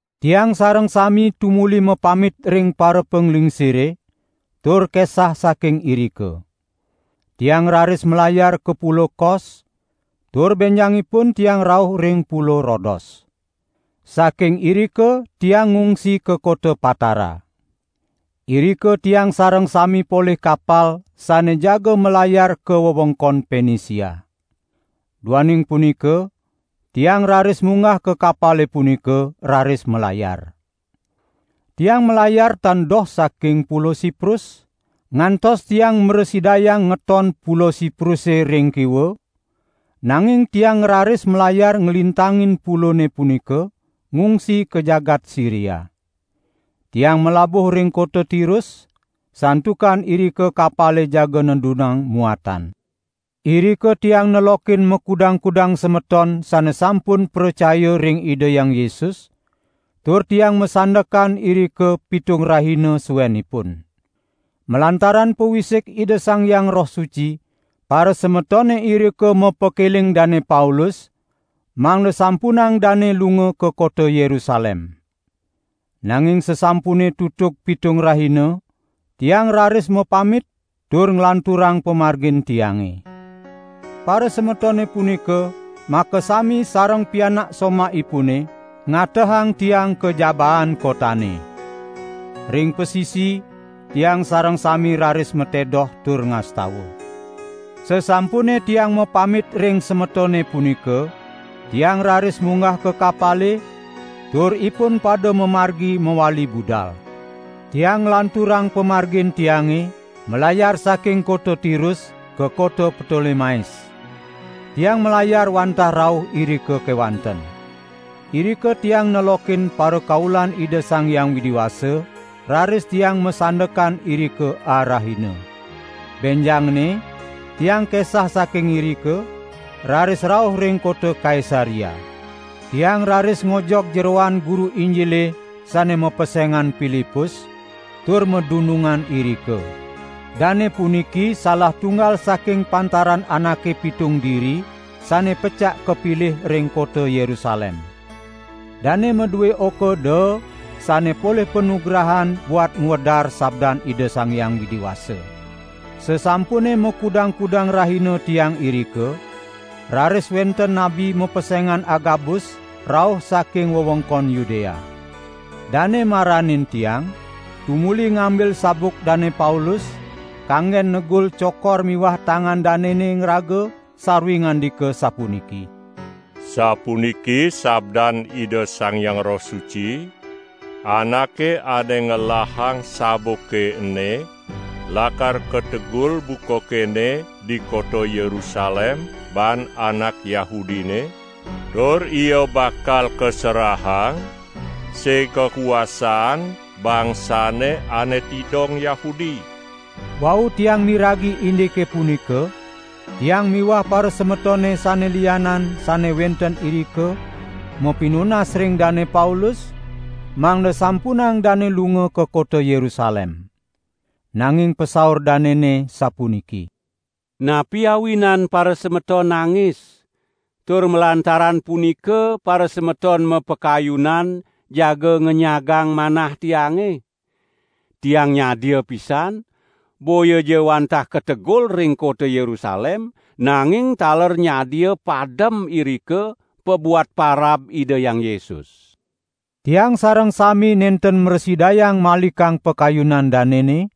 Tiang sareng sami tumuli mapamit ring parapanglingsire, tur kesah saking irika. Tiang ngraris malayar ka Pulo Kos, tur benjangipun tiang rauh ring Pulo Rodos. Saking irika tiang ngungsi ka kota Patara. Irika tiang sareng sami polih kapal sane jaga malayar ka wewengkon Penisia. Duaning punika tiang raris munggah ka kapale punika, raris malayar. Tiang malayar tan doh saking Pulo Siprus, ngantos tiang mrasidayang ngeton Pulo Sipruse ring kiwa, nanging tiang ngraris malayar nglintangin pulone punika, ngungsi ka jagat Siria. Tiang malabuh ring kota Tirus, santukan irika kapale jaga nedunang muatan. Irika tiang nelokin makudang-kudang semeton sane sampun pracaya ring Ida Hyang Yesus, tur tiang masandekan irika pitung rahina suenipun. Malantaran pawisik Ida Sang Hyang Roh Suci, parasemetone irika mapakeling Dane Paulus, mangda sampunang dane lunga ka kota Yerusalem. Nanging sasampune tutug pitung rahina, tiang raris mapamit tur nglanturang pamargin tiange. Parasemetone punika makasami sareng pianak somahipune, ngatehang tiang ka jabaan kotane. Ring pasisi tiang sareng sami raris matedoh tur ngastawa. Sasampune tiang mapamit ring semetone punika, tiang raris munggah ka kapale, tur ipun pada mamargi mawali budal. Tiang nglanturang pamargin tiange, malayar saking kota Tirus ka kota Ptolemais. Tiang malayar wantah rauh irika kewanten. Irika tiang nelokin parakaulan Ida Sang Hyang Widi Wasa raris tiang masandekan irika arahina. Benjangne tiang kesah saking irika, raris rauh ring kota Kaisarea. Tiang raris ngojog jeroan guru Injile sane mapesengan Pilipus, tur madunungan irika. Dane puniki salah tunggal saking pantaran anake pitung diri sane pecak kapilih ring kota Yerusalem. Dane madue oka daa sane polih panugrahan buat ngwedar sabdan Ida Sang Hyang Widi Wasa. Sasampune makudang-kudang rahina tiang irika, raris wenten nabi mapesengan Agabus rauh saking wewengkon Yudea. Dane maranin tiang, tumuli ngambil sabuk Dane Paulus, kanggen negul cokor miwah tangan danene ngraga sarwi ngandika sapuniki: "Sapuniki sabdan Ida Sang Hyang Roh Suci: Anake ane ngelahang sabuke ene lakar kategul buka kene di kota Yerusalem baan anak Yahudine tur ia bakal kaserahang sig kakuasaan bangsane ane tidong Yahudi." Wau tiang miragi indike punika, tiang miwah parasemetone sane lianan sane wenten irika mapinunas ring Dane Paulus, mangda sampunang dane lunga ka kota Yerusalem. Nanging pasaur danene, sapuniki: "Napi awinan parasemeton nangis, tur malantaran punika parasemeton mapakayunan jaga ngenyagang manah tiange? Tiang nyadia pisan, boyaja wantah kategul ring kota Yerusalem, nanging taler nyadia padem irika, pabuat parab Ida Hyang Yesus." Tiang sareng sami nenten mrasidayang malikang pakayunan danene,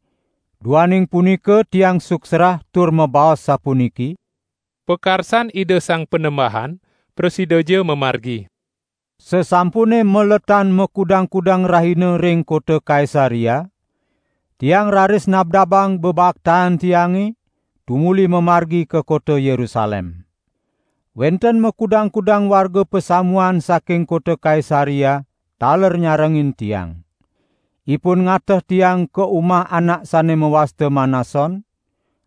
duaning punika tiang suksrah tur mabaos sapuniki: "Pakarsan Ida Sang Panembahan prasidaja mamargi!" Sasampune maletan makudang-kudang rahina ring kota Kaisarea, tiang raris nabdabang bebaktaan tiange, tumuli mamargi ka kota Yerusalem. Wenten makudang-kudang warga pasamuan saking kota Kaisarea taler nyarengin tiang. Ipun ngateh tiang ka umah anak sane mawasta Manason,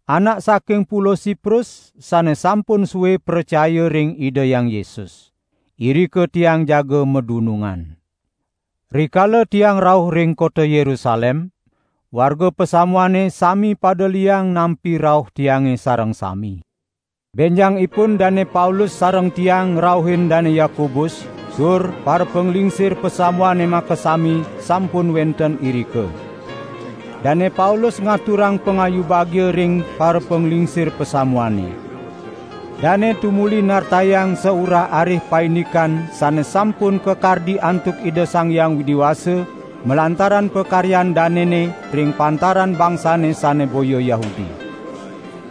anak saking Pulo Siprus sane sampun sue pracaya ring Ida Hyang Yesus. Irika tiang jaga madunungan. Rikala tiang rauh ring kota Yerusalem, warga pasamuane sami pada liang nampi rauh tiange sareng sami. Benjangipun Dane Paulus sareng tiang ngrauhin Dane Yakobus, tur parapanglingsir pasamuane makasami sampun wenten irika. Dane Paulus ngaturang pangayu bagia ring parapanglingsir pasamuane. Dane tumuli nartayang saurah-arih paindikan sane sampun kakardi antuk Ida Sang Hyang Widi Wasa malantaran pakaryan danene ring pantaran bangsane sane boya Yahudi.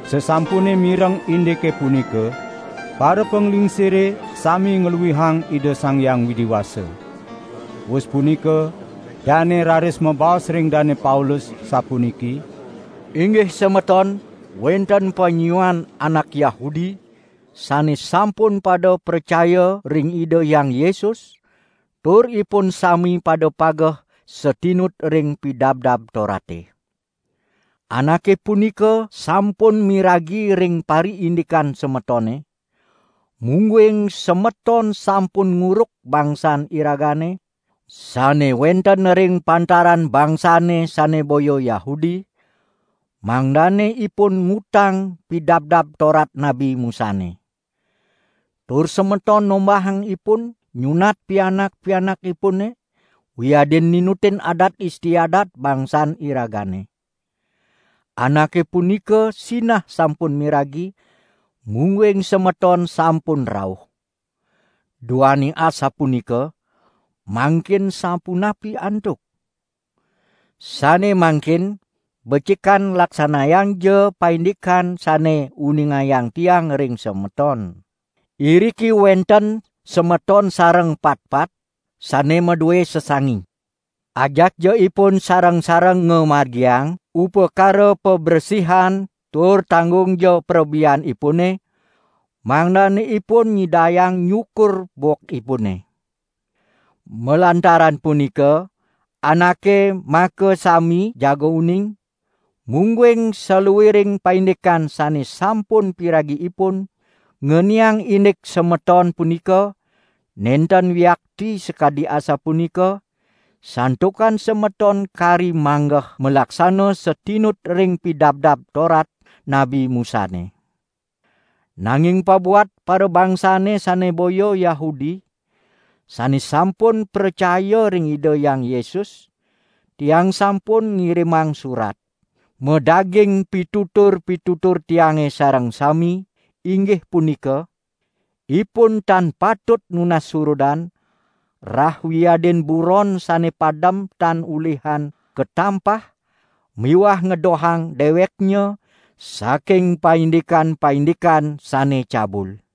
Sasampune mireng indike punika, parapanglingsire sami ngluihang Ida Sang Hyang Widi Wasa. Wus punika dane raris mabaos ring Dane Paulus, sapuniki: "Inggih semeton, wenten panyiuan anak Yahudi sane sampun pada pracaya ring Ida Hyang Yesus tur ipun sami pada pageh satinut ring Pidabdab Torate. Anake punika sampun miragi ring pariindikan semetone, mungguing semeton sampun nguruk bangsan iragane sane wenten ring pantaran bangsane sane boya Yahudi, mangdane ipun ngutang Pidabdab Torat Nabi Musane. Tur semeton nombahang ipun nyunat pianak-pianakipune wiadin ninutin adat istiadat bangsan iragane. Anake punika sinah sampun miragi, mungguing semeton sampun rauh. Duaning asapunika, mangkin sapunapi antuk? Sane mangkin becikan laksanayangja paindikan sane uningayang tiang ring semeton. Iriki wenten semeton sareng patpat sane madue sesangi. Ajakja ipun sareng-sareng ngamargiang upakara pabresihan tur tanggungja prabeanipune, mangdane ipun nyidayang nyukur bokipune. Malantaran punika anake makasami jaga uning, mungguing saluiring paindikan sane sampun piragi ipun ngeniang indik semeton punika nenten wiakti sakadi asapunika, santukan semeton kari manggeh malaksana satinut ring Pidabdab Torat Nabi Musane. Nanging pabuat parabangsane sane boya Yahudi, sane sampun pracaya ring Ida Hyang Yesus, tiang sampun ngirimang surat, madaging pitutur-pitutur tiange sareng sami, inggih punika: 'Ipun tan patut nunas surudan, rah wiadin buron sane padem tan ulihan katampah miwah ngedohang deweknya saking paindikan-paindikan sane cabul.' "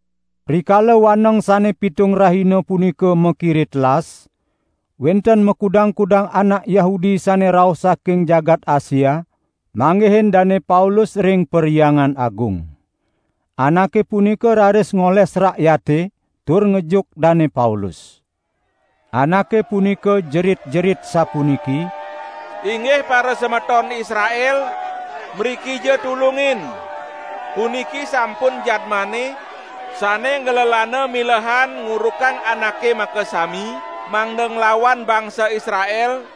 Rikala waneng sane pitung rahina punika makire telas, wenten makudang-kudang anak Yahudi sane rauh saking jagat Asia, manggihin Dane Paulus ring Perhyangan Agung. Anake punika raris ngoles rakyate tur ngejuk Dane Paulus. Anake punika jerit-jerit sapuniki: "Inggih parasemeton Israel, mrikija tulungin! Puniki sampun jadmane sane nglelana milehan ngurukang anake makasami mangda nglawan bangsa Israel,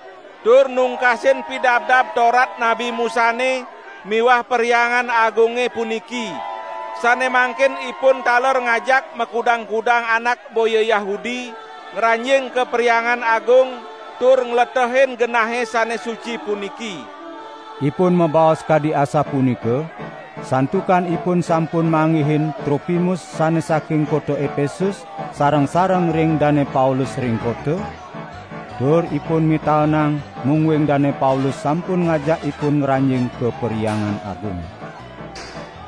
tur nungkasin Pidabdab Torat Nabi Musane miwah Perhyangan Agunge puniki. Sane mangkin ipun taler ngajak makudang-kudang anak boya Yahudi ngranjing ka Perhyangan Agung tur ngletehin genahe sane suci puniki." ( Ipun mabaos kadi asapunika, santukan ipun sampun manggihin Tropimus sane saking kota Epesus sareng-sareng ring Dane Paulus ring kota, tur ipun mitaenang mungguing Dane Paulus sampun ngajak ipun ngranjing ka Perhyangan Agung.)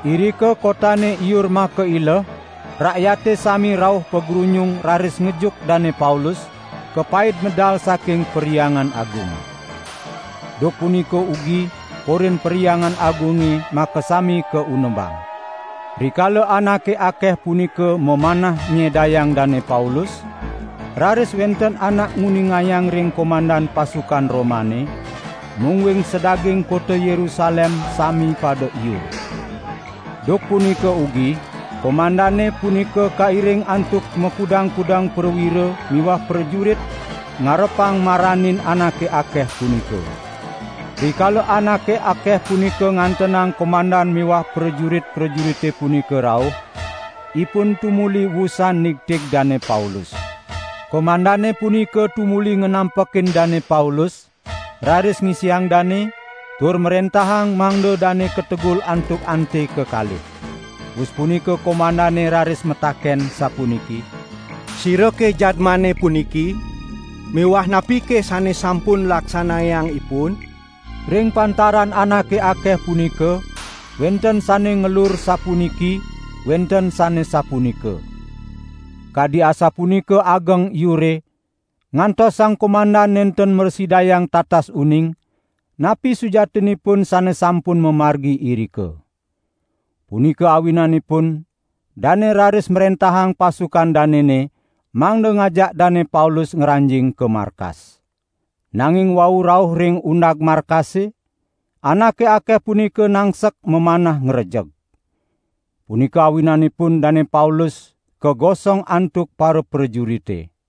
Irika kotane iur makaileh, rakyate sami rauh pagrunyung raris ngejuk Dane Paulus, kapaid medal saking Perhyangan Agung. Duk punika ugi korin Perhyangan Agunge makasami kaunebang. Rikala anake akeh punika mamanah nyedayang Dane Paulus, raris wenten anak nguningayang ring komandan pasukan Romane, mungguing sadaging kota Yerusalem sami pada iur. Duk punika ugi komandane punika kairing antuk makudang-kudang prawira miwah prajurit ngarepang maranin anake akeh punika. Rikala anake akeh punika ngantenang komandan miwah prajurit-prajurite punika rauh, ipun tumuli wusan nigtig Dane Paulus. Komandane punika tumuli nganampekin Dane Paulus, raris ngisiang dane, tur mrentahang mangda dane kategul antuk ante kekalih. Wus punika komandane raris mataken sapuniki: "Sirake jadmane puniki miwah napike sane sampun laksanayang ipun?" Ring pantaran anake akeh punika wenten sane ngelur sapuniki, wenten sane sapunika. Kadi asapunika ageng iure, ngantos sang komandan nenten mrasidayang tatas uning napi sujatinipun sane sampun mamargi irika. Punika awinanipun dane raris mrentahang pasukan danene mangda ngajak Dane Paulus ngranjing ka markas. Nanging wau rauh ring undag markase, anake akeh punika nangsek mamanah ngrejek. Punika awinanipun Dane Paulus kagosong antuk paraprajurite.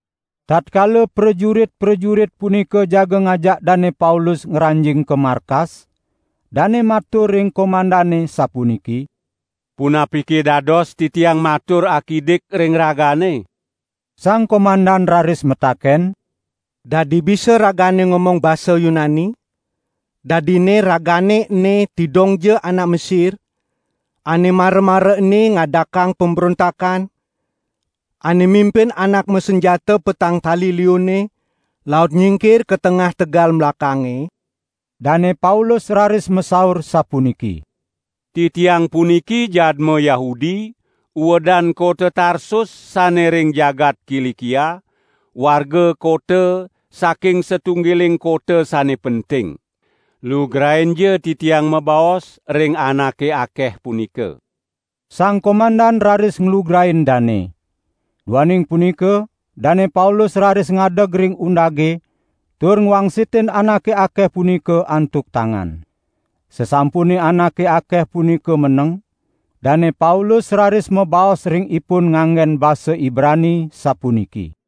Tatkala prajurit-prajurit punika jaga ngajak Dane Paulus ngranjing ka markas, dane matur ring komandane sapuniki: "Punapike dados titiang matur akidik ring ragane?" Sang komandan raris mataken: "Dadi bisa ragane ngomong basa Yunani? Dadinne ragane ene tidongja anak Mesir ane mara-mara ene ngadakang pembrontakan, ane mimpin anak masanjata petang tali liunne, laut nyingkir ka tengah tegal melakange?" Dane Paulus raris masaur sapuniki: "Titiang puniki jadma Yahudi, uedan kota Tarsus sane ring jagat Kilikia, warga kota saking satunggiling kota sane penting. Lugrainja titiang mabaos ring anake akeh punika." Sang komandan raris nglugrain dane. Duaning punika Dane Paulus raris ngadeg ring undage tur ngwangsitin anake akeh punika antuk tangan. Sasampune anake akeh punika meneng, Dane Paulus raris mabaos ring ipun nganggen basa Ibrani, sapuniki: